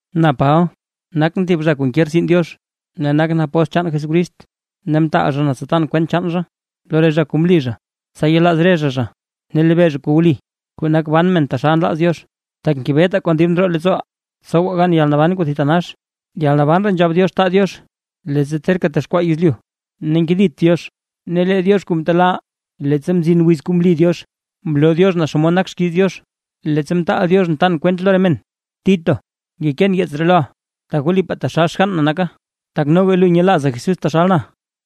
Na Paba, nakʼn thib zha kuu nke rtsin Diox, ne nakʼn apóstl chaan Jesucrist, ne mtaal zha na tsa tan kwent chaan zha lo re zha kuu mli zha, tsa yelaaz re zha zha ne lebee zha kuu wli, kuu nak ban men taxal nlaaz Diox, tak ngebetaa kon dib ndroo leettsooʼaa tsowaa gan yalnaban kuu thitanax, yalnaban ree nzhab Diox taa Diox leettsa terka texkwaa yezlyu, ne nkedit Diox; ne lee Diox kuu mtelaaʼaa, leettsa mzin wiz kuu mli Diox, mloo Diox naa xomod nak xkiiz Diox, leettsa mtaal Diox na tan kwente lo re men. Tito ngekeen yeets ree loʼa, tak wlipaa taxal xgann na naka, tak noga lu nyelaaza Jesús taxal na.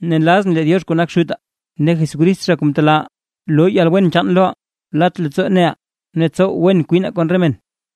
Ne nlazʼn lee Diox kuu nak Xutaa ne Jesucrist zha kuu mtelaaʼaa, loo yalwen chaan loʼa, lat leettsoo neʼa ne tsow wen kwina kon re men.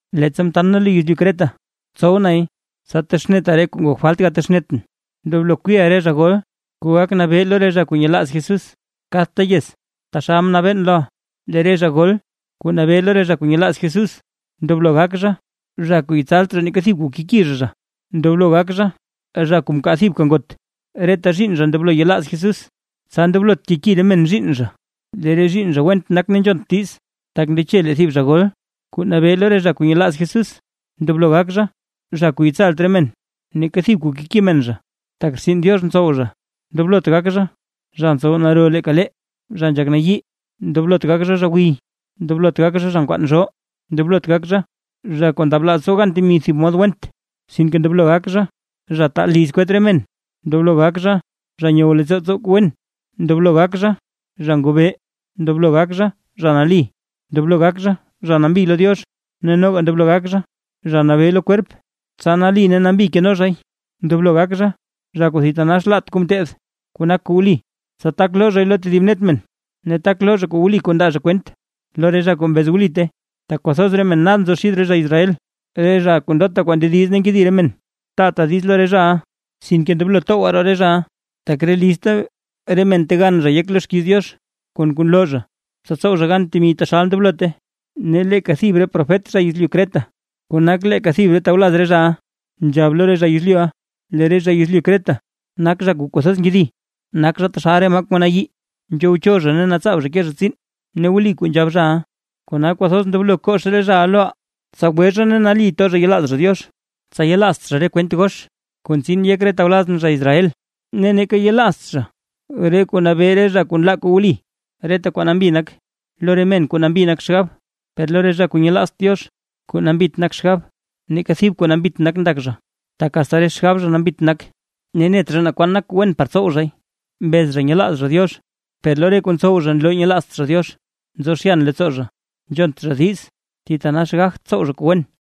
Leettsa mtan na lu yezlyu Creta, mtsow nay tsa texneta re kuu ngok falt gatexnetʼn. Ndoblo kwiiʼa re zha gol kuu gak nabee lo re zha kuu nyelaaz Jesús kadta yez, taxal mnabeen loʼa. Lee re zha gol kuu nabee lo re zha kuu nyelaaz Jesús ndoblo gak zha. Zha kuu yetsalt zha neeka thib kuu keki zha zha. Ndoblo gak zha, zha kuu mkaa thibka ngot, reta zhiinn zha ndoblo nyelaaz Jesús, tsa ndoblot keki re men zhiinn zha lee re zhiinn zha went nak ne nzhont diiz. Tak ndeche lee thib zha gol kuu nabee lo re zha kuu nyelaaz Jesús, ndoblo gak zha, zha kuu yetsalt re men neeka thib kuu keki men zha, tak rtsin Diox ntsow zha. Ndoblot gak zha: zha ntsow naro leeka lee, zha nzhak nayii, ndoblot gak zha, zha gwiy, ndoblot gak zha, zha nkwaan zhoo, ndoblot gak zha, zha kuu ndablaaz tsow gan temi thib mod kuu went. Sinke ndoblo gak zha: zha taa liz kwet re men, ndoblo gak zha, zha nyow leettsoo tsow kuu wen, ndoblo gak zha, zha ngobee, ndoblo gak zha, zha nali, ndoblo gak zha, zha nambi lo Diox, ne noga ndoblo gak zha, zha nabee lo kwerp, tsa nali ne nambi keno zhay. Ndoblo gak zha, zha kuu thitanax laat kuu mteed, kuu nak kuu wli, tsa tak loo zhay lo tedib net men, ne tak loo zha wli kuu ndaa zha kwent lo re zha kuu mbez wlite. Tak kwathoz men nad nzo xid re zha Israel, re zha kuu ndota kuu ndediz ne nkedi re men. Taata diiz lo re zhaʼa sinke ndoblo towgwa roo re zhaʼa, tak re lizta re men ntegan zha yek lo xkiiz Diox kon kuu nloo zha, tsa tsow zha gan temi taxal ndoblote. Ne leeka thib re profet zha yezlyu Creta kuu nak leeka thib tawlaz re zhaʼa, nzhab lo re zha yezlyuʼa: “Lee re zha yezlyu Creta, nak zha kuu kwathoz nkedi, nak zha taxal re maa kuu nayii, nzhowcho zha ne natsaab zha kee zha tsiin”. Ne wli kuu nzhab zhaʼa; kona kwathoz ndoblo kox re zhaʼa loʼa, tsa gwe zha ne nali to zha yelaaz zha Diox, tsa yelaazt zha re kwent gox kuu ntsin yek re tawlazʼn zha Israel, ne neeka yelaazt zha re kuu nabee re zha kuu nlaa kuu wli. Reta kwaa nambi nak lo re men kuu nambi nak xgab, per lo re zha kuu nyelaazt Diox kuu nambit nak xgab, neeka thib kuu nambit ndak zha, tak asta re xgab zha nambit nak ne net zha na kwaan nak kuu wen par tsow zhay. Mbez zha nyelaaz zha Diox, per lo re kuu ntsow zha nloo nyelaazt zha Diox. Nzo zhyan leettsoo zha, nzhont zha diiz, ne thitanax gagt tsow zha kuu wen.